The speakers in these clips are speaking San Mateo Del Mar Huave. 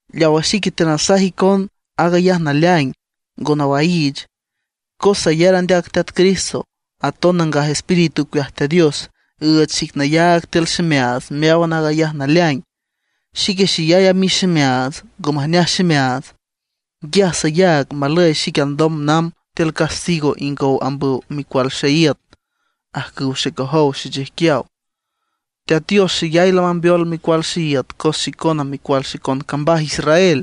Leawa xique teanasaj icon, aag ayaj naleaing, ngo nawaiich, cos sayar andeac Teat Cristo. Aton Nangaj Espíritu ocueaj Teat Dios üüch xic nayaag tiül ximeaats meáwan aag ayaj naleaing. Xique xeyay amix ximeaats, ngo majneaj ximeaats. Nguiaj sayaag malüy xique alndom namb tiül castigo ingow ambüw micual xeíüt, ajcüw xecojow, xechijquiaw. Teat Dios xeyay lamambeol micual xeíüt cos xicona micual xicon cambaj Israel.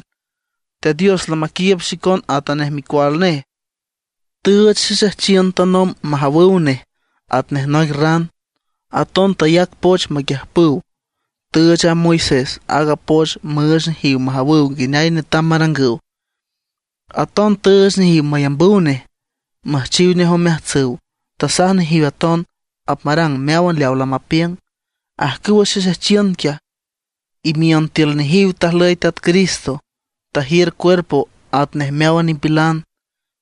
Teat Dios lamaquiiüb xicon atanej micual nej, tüüch xexejchiün tanomb majawüw nej atnej noic ran. Aton tayac poch maquiüjpüw, tüüch a Moisés aaga poch müüch nejiw majawüw nguineay netam marangüw. Aton tüüch nejiw mayambüw nej, müjchiw nej omeajtsüw, tasaj nejiw aton apmarang meáwan leaw lamapiüng. Ajcüwa xexejchiün quiaj, imiün tiül nejiw tajlüy Teat Cristo, tajiür cuerpo atnej meáwan nipilan,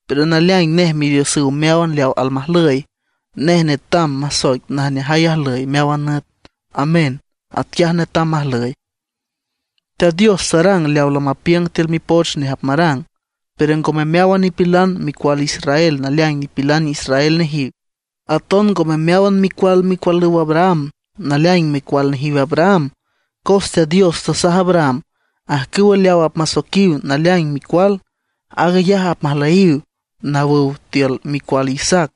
pero naleaing nej Midiosüw meáwan leaw almajlüy. Nej netam masoic najneajay ajlüy meáwan nüt. Amén, atquiaj netam majlüy. Teat Dios tarang leaw lamapiüng tiül Mipoch nej apmarang, pero ngome meáwan nipilan micual Israel naleaing nipilan israel nejiw. Aton ngome meáwan micual micualüw Abraham naleaing micual nejiw Abraham; cos Teat Dios tasaj Abraham: “Ajcüwa leaw apmasoiquiw naleaing micual, aag ayaj apmajlüyiw nawüw tiül micual Isaac”.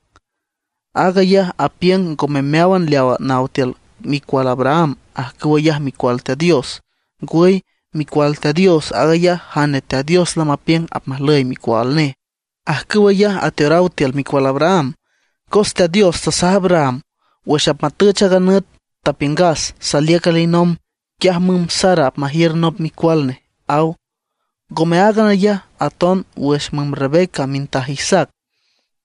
Aag ayaj apiüng ngome meáwan leawa naw tiül micual Abraham ajcüw ayaj micual Teat Dios; ngwüy, micual Teat Dios aag ayaj jane Teat Dios lamapiüng apmajlüy micual nej, ajcüw ayaj ateoraw tiül micual Abraham. Cos Teat Dios tasaj Abraham: “Wüx apmatüch aaga nüt tapiüngas, saliüc alinomb, quiaj müm Sara apmajiür nop micual nej”, aw. Ngome áagan ayaj, aton wüx müm Rebeca mintaj Isaac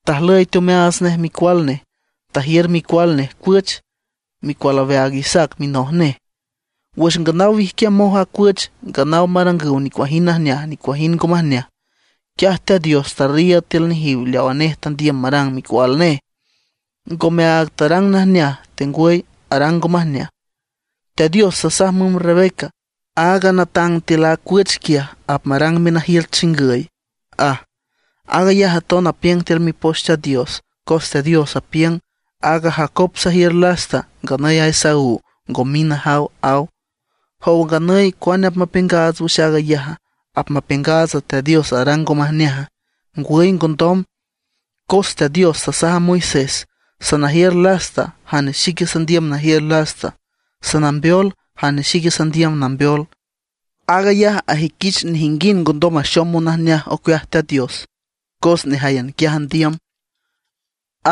tajlüy teomeaats nej micual nej, tajiür micual nej cuüch, micual aweaag Isaac minoj nej. Wüx nganaw wijquiamoj a cuüch, nganaw marangüw nicuajind najneaj nicuajind ngo majneaj; quiaj Teat Dios tarriiüd tiül nejiw leawa nej tandiüm marang micual nej, ngome aag tarang najneaj tengwüy arang ngo majneaj. Teat Dios tasaj müm Rebeca: “Aaga natang tiül a cuüch quiaj, apmarang minajiüt chingüy”, aj. Aag ayaj aton apiüng tiül Mipoch Teat Dios, cos Teat Dios apiüng: “Aaga Jacob sajiür lasta, nganüy aaga Esaú ngo mind najaw”, aw. ¿Jowa nganüy cuane apmapiüngaats wüx aag ayaja? ¿Apmapiüngaats Teat Dios arang ngo majneaja? ¡Ngwüy ngondom! Cos Teat Dios tasaj a Moisés: “Sanajiür lasta jane xique sandiüm najiür lasta, sanambeol jane xique sandiüm nambeol”. Aag ayaj ajüiquich nejinguind ngondom maxom monajneaj ocueaj Teat Dios por nejáyan quiaj andiüm,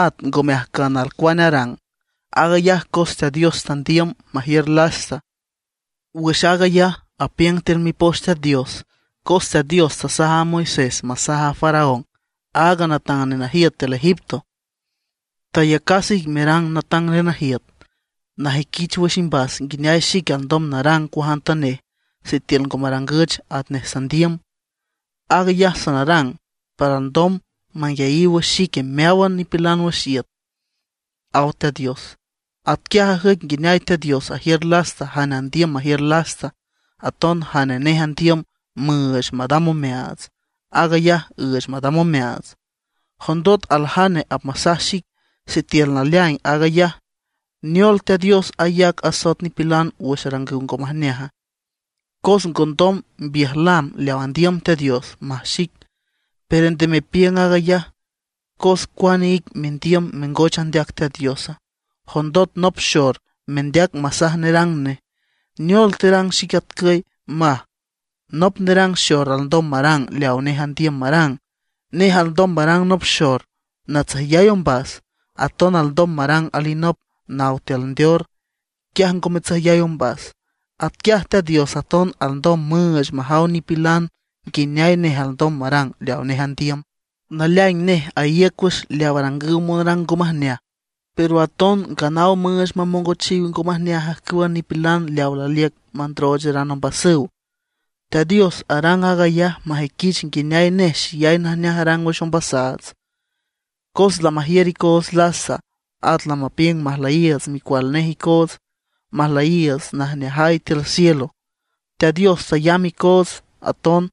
at ngome ajcan alcuane arang, aag ayaj cos Teat Dios tandiüm majiür lasta. Wüx aag ayaj apiüng tiül Mipoch Teat Dios, cos Teat Dios tasaj a Moisés masaj a Faraón, aaga natang nenajiüt tiül Egipto: “Tayacas ic merang natang nenajiüt, najüiquich wüx imbas nguineay xique alndom narang cuajantanej sitiül ngo marangüch atnej sandiüm. Aag ayaj sanarang para alndom manguiayiw wüx xique meáwan nipilan wüx iüt”, aw Teat Dios. Atquiaj ajüic nguineay Teat Dios ajiür lasta jane andiüm majiür lasta, aton jane nej andiüm müüch madam omeaats, aag ayaj üüch madam omeaats. Jondot aljane apmasaj xic: “Sitiül naleaing aag ayaj, ¿neol Teat Dios ayac asoet nipilan wüx arangüw ngo majneaja? cos ngondom mbiüjlam leaw andiüm Teat Dios”, maj xic. Pero nde mepiüng aag ayaj, ¿cos cuane ic mendiüm mengoch andeac Teat Diosa? Jondot nop xor mendeac masaj nerang nej: “¿Neol terang xic atcüy?” maj. Nop nerang xor alndom marang leawa nej andiüm marang. Nej alndom marang nop xor natsüjyay ombas, aton alndom marang alinop nawan tiül ndeor, quiaj ngo matsüjyay ombas. Atquiaj Teat Dios aton alndom müüch majaw nipilan nguineay nej alndom marang leawa nej andiüm. Naleaing nej aíüc wüx leaw arangüw monrang ngo majneaj, pero aton nganaw müüch mamongochiw ngo majneaj ajcüwa nipilan leawa laliüc mandroocheran ombasüw. Teat Dios arang aag ayaj majüiquich nguineay nej xeyay najneaj arang wüx ombasaats, cos lamajiür icoots lasta; at lamapiüng majlüyiiüts micual nej icoots, majlüyiiüts najneajay tiül cielo. Teat Dios tayamb icoots aton,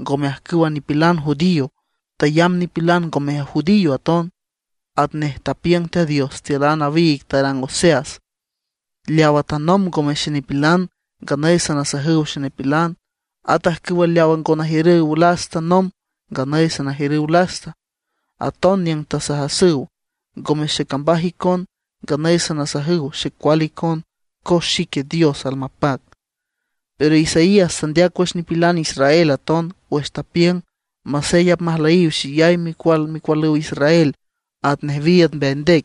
ngome ajcǘwan a nipilan judío; tayamb nipilan ngome judío aton. Atnej tapiüng Teat Dios tiül a nawiig tarang Oseas: Leawa tanomb ngome xenipilan, nganüy sanasajüw xenipilan; at ajcüwa leaw ngo najiürüw lasta nomb, nganüy sanajiürüw lasta. Aton niüng tasajasüw: “Ngome xecambaj icon”, nganüy sanasajüw xecual icon, cos xique Dios almapac. Pero Isaías tandeac wüx nipilan israel aton, wüx tapiüng: “Masey apmajlüyiw xeyay micual micualüw Israel atnej wiiüd mbeay ndec,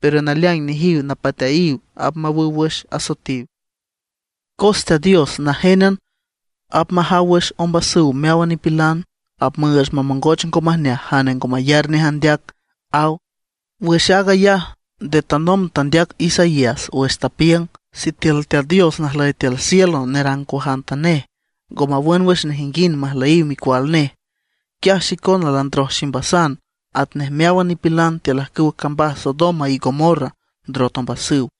pero naleaing nejiw napateayiw apmawüw wüx asoetiw. Cos Teat Dios najénan apmajaw wüx ombasüw meáwan nipilan; apmüüch mamongoch ngo majneaj jane ngo mayar nej andeac”, aw. Wüx aag ayaj nde tanomb tandeac Isaías wüx tapiüng: Sitiül Teat Dios najlüy tiül cielo y nerang cuajantanej, ngo mawün wüx nejinguind majlüyiw micual nej, quiaj xicona landroj ximbasan atnej meáwan nipilan tiül ajcüwa cambaj Sodoma y Gomorra ndrot ombasüw.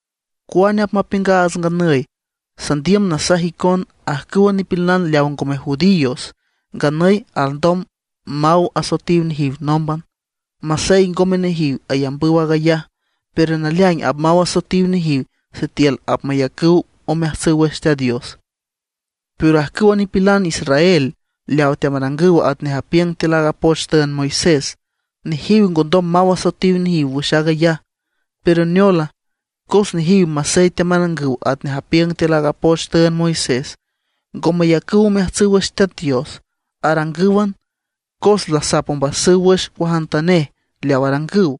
¿Cuane apmapiüngaats nganüy? Sandiüm nasaj icon, ajcüwa nipilan leaw ngome judíos nganüy alndom maw asoetiw nejiw nómban. Masey ngome nejiw ayambüw aag ayaj, pero naleaing apmaw asoetiw nejiw sitiül apmayacüw omeajtsüw wüx Teat Dios. Pero ajcüwa nipilan israel leaw teamarangüw atnej apiüng tiül aaga poch tüünd Moisés, nejiw ngondom maw asoetiw nejiw wüx aag ayaj. ¿Pero neola? Cos nejiw masey teamarangüw atnej apiüng tiül aaga poch tüünd Moisés, ngo mayacüw omeajtsüw wüx Teat Dios. Arangǘwan, cos lasap ombasüw wüx cuajantanej leaw arangüw.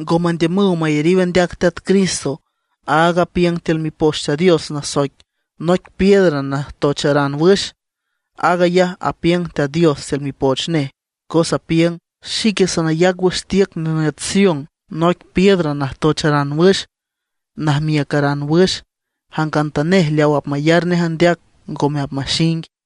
Ngo mandiümüw mayariw andeac Teat Cristo, aaga apiüng tiül Mipoch Teat Dios nasoic “noic piedra najtocharan wüx”. Aag ayaj apiüng Teat Dios tiül Mipoch nej, cos apiüng: Xique sanayac wüx tiüc nenüt Sion noic piedra najtocharan wüx, najmiücaran wüx; jangantanej leaw apmayar nej andeac, ngome apmaxing.